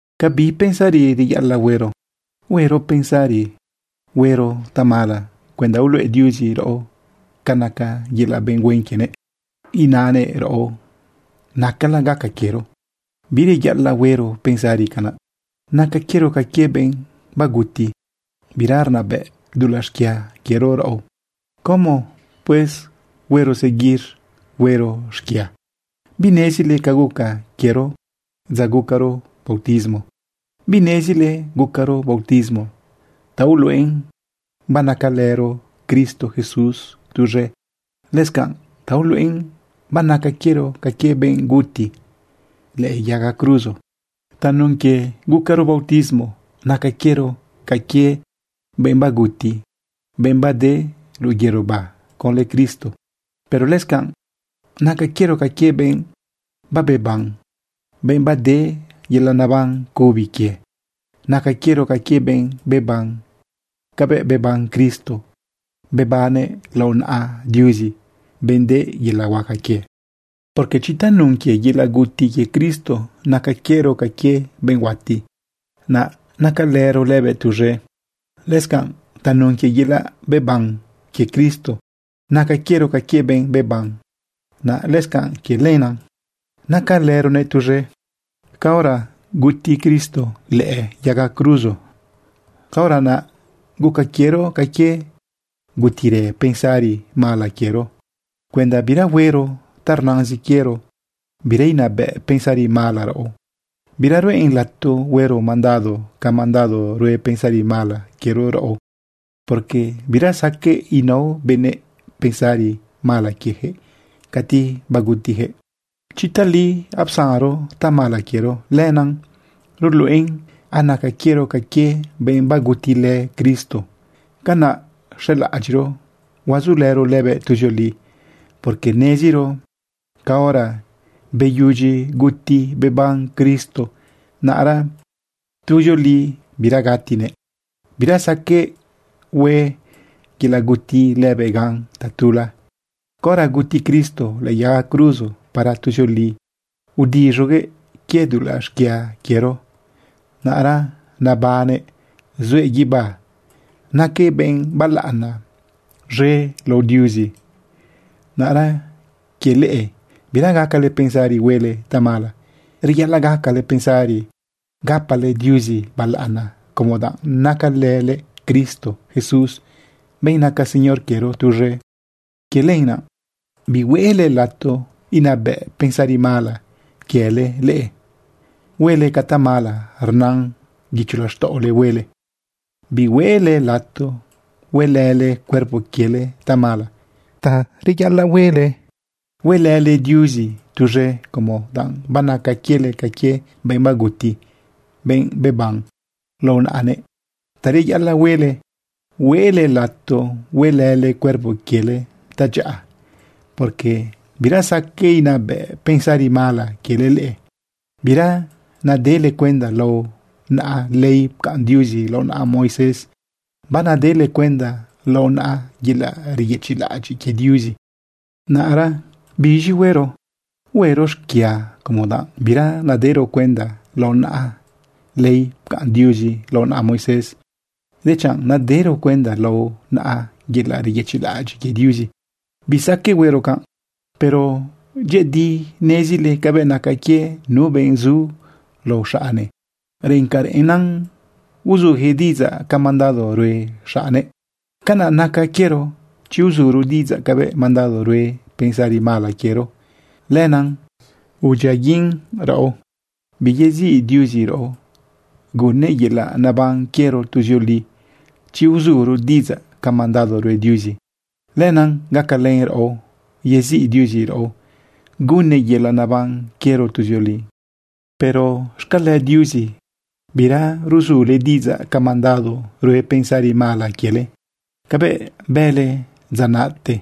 ¿Ca bi pensari reyaꞌalaꞌ huero? ¿Huero pensari huero tamala cuenda uluꞌe Diuzi raꞌo ca naca yelaꞌ benꞌ huen quienëꞌ inaꞌnëꞌ raꞌo nacala gaca quiero? ¡Bireyaꞌalaꞌ huero pensari canaꞌ! Naca quiero ca quie benꞌ baguti, bira rnabëꞌ dulaꞌ xquia quiero raꞌo. ¿Cómo pues huero seguir huero xquia? ¿Binezile ca guca quiero dza gucaro bautismo? ¿Binezile gucaro bautismo ta uluꞌen banacalëro Cristo Jesús tuz̃e, lëscanꞌ ta uluꞌen banaca quiero ca quie benꞌ guti lëꞌë yaga cruzo? Tanun quie gucaro bautismo naca quiero ca quie benꞌ baguti, benꞌ bade luꞌu yerobá conlë Cristo. Pero lëscanꞌ naca quiero ca quie benꞌ babeban, benꞌ bade yelaꞌ neban cubi quie. Naca quiero ca quie benꞌ beban cabëꞌ beban Cristo, bebannëꞌ lao naꞌa Diuzi, benꞌ de yelaꞌ huaca quie. Porque chi tanun quie yelaꞌ guti quie Cristo naca quiero ca quie benꞌ huati, naꞌ nacalëro lëbëꞌ tuz̃e, lëscanꞌ tanun quie yelaꞌ beban quie Cristo naca quiero ca quie benꞌ beban, naꞌ lëscanꞌ quie lenaꞌ nacalëronëꞌ tuz̃e. Caora guti Cristo lëꞌë yaga cruzo, caora naꞌ guca quiero ca quie gutirë pensari mala quiero cuenda bira huero ta rnazin quiero, bira inabëꞌ pensari mala raꞌo, bira ruꞌen lato huero mandado ca mandado rue pensari mala quiero raꞌo. Porque bira saqueꞌ inao benëꞌ pensari mala quieyaquëꞌ cati bagutiyaquëꞌ. Chi tali apsanro tamala quiero, lenaꞌ ruluꞌen anaca quiero ca quie benꞌ bagutilë Cristo. Canaꞌ xelaꞌadyiꞌro huazulëro lëbëꞌ tuzioli. Porque neziro caora beyudyi guti beban Cristo, naꞌra tuzioli bira gatinëꞌ. Bira saqueꞌ hue yelaꞌ guti lëbëꞌ gan tatula. Caora guti Cristo lëꞌë yaga cruzo, para tuzioli udiz̃uguëꞌ quie dulaꞌ xquia quiero. Naꞌra nabannëꞌ zuëꞌ guibá naquëꞌ benꞌ balaꞌana z̃e lao Diuzi. Naꞌra quie leꞌe, bira gacale pensari huele tamala, reyaꞌalaꞌ gacale pensari gapale Diuzi balaꞌana como danꞌ nacalële Cristo Jesús, benꞌ naca Señor quiero, tuz̃e. Quie lenaꞌ bihueꞌle lato inabëꞌ pensari mala quiele leꞌe huele ca tamala rnan guicho laxtaꞌole huele. Bihueꞌle lato huelële cuerpo quiele tamala. Ta reyaꞌalaꞌ huele, huelële Diuzi tuz̃e como danꞌ banaca quiele ca quie benꞌ baguti, benꞌ beban lao naꞌanëꞌ. Ta reyaꞌalaꞌ huele, hueꞌle lato huelële cuerpo quiele tadyaꞌa. Porque bira saqueꞌ inabëꞌ pensari mala quiele leꞌe. Bira nadele cuenda lao naꞌa ley pcaꞌn Diuzi lao naꞌa Moisés, banadele cuenda lao naꞌa yelaꞌ reyëchiꞌlaꞌadyiꞌ quie Diuzi. ¿Naꞌra biz̃i huero? ¿Huero xquia como danꞌ bira nadero cuenda lao naꞌa ley pcaꞌn Diuzi lao naꞌa Moisés, dechanꞌ nadero cuenda lao naꞌa yelaꞌ reyëchiꞌlaꞌadyiꞌ quie Diuzi? ¡Bisaqueꞌ huero canꞌ! Pero dyëꞌëdi nezile cabëꞌ naca quie nu benꞌ zu lao xaꞌne. Reꞌen ca reꞌenna uzujëꞌ diꞌidzaꞌ ca mandado rue xaꞌne. Canaꞌ naca quiero. Chi uzuro diꞌidzaꞌ cabëꞌ mandado rue pensari mala quiero, lenaꞌ udyiaguiꞌn raꞌo, biyeziꞌ Diuzi raꞌo gunnëꞌ yelaꞌ naban quiero tuzioli. Chi uzuro diꞌidzaꞌ ca mandado rue Diuzi, lenaꞌ gacalën raꞌo yeziꞌ Diuzi raꞌo gunnëꞌ yelaꞌ naban quiero tuzioli. Pero xcale Diuzi, bira rzule diꞌidzaꞌ ca mandado rue pensari mala quiele, cabëꞌ bële dza naꞌte.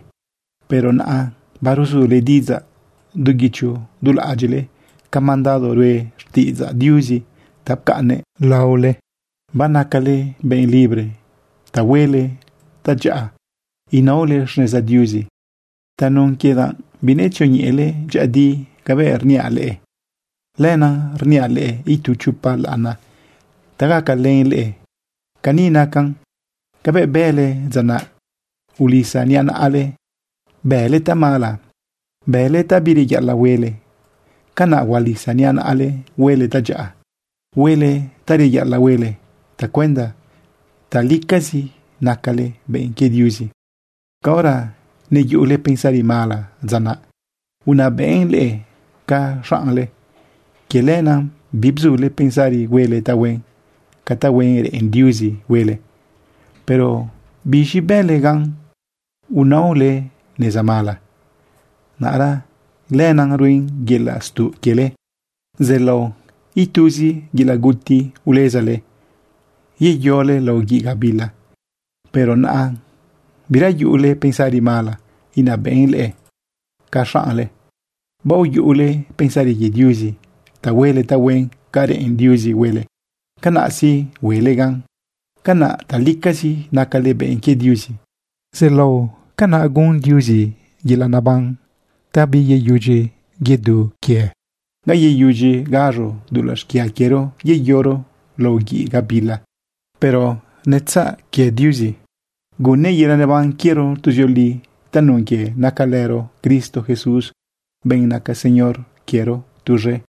Pero naꞌa baruzule diꞌidzaꞌ du guicho du laꞌadyiꞌle ca mandado rue xtiꞌidzaꞌ Diuzi ta pcaꞌnnëꞌ laohuele. Banacale benꞌ libre ta huele tadyaꞌa inaole xneza Diuzi. (Tanun quie danꞌ binetzioñeꞌele dyëꞌëdi cabëꞌ rniaꞌ leꞌe, lenaꞌ rniaꞌ leꞌe itu chopa laꞌana ta gacalën leꞌe.) Cani nacan. Cabëꞌ bële dza naꞌ ulisa niꞌa naꞌale bële tamala, bële ta bireyaꞌalaꞌ huele, canaꞌ hualisa niꞌa naꞌale huele tadyaꞌa, huele ta reyaꞌalaꞌ huele, tacuenda talicazi nacale benꞌ quie Diuzi. Caora neyuꞌule pensari mala dza naꞌ, unabëꞌn leꞌe ca xaꞌnle, quie lenaꞌ bibzule pensari huele tahuen ca tahuen reꞌen Diuzi huele. ¿Pero biz̃i bële gan unaole neza mala? Naꞌra lenaꞌ ruen yelaꞌ stuꞌ quiele. Zëꞌlao ituzi yelaꞌ guti ulezale yeyole lao guiꞌ gabila. Pero naꞌa bira yuꞌule pensari mala inabëꞌn leꞌe ca xaꞌnle. Baoyuꞌule pensari quie Diuzi ta huele tahuen ca reꞌen Diuzi huele. Canaꞌ sí huele gan. Canaꞌ talicazi nacale benꞌ quie Diuzi. Zeꞌlao canaꞌ gun Diuzi yelaꞌ neban ta biyeyudyi yedu quie. Ga yeyudyi gaz̃o dulaꞌ xquia quiero yeyoro lao guiꞌ gabila. Pero netzaꞌ quie Diuzi gunnëꞌ yelaꞌ neban quiero tuzioli tanun quie nacalëro Cristo Jesús, benꞌ naca Señor quiero, tuz̃e.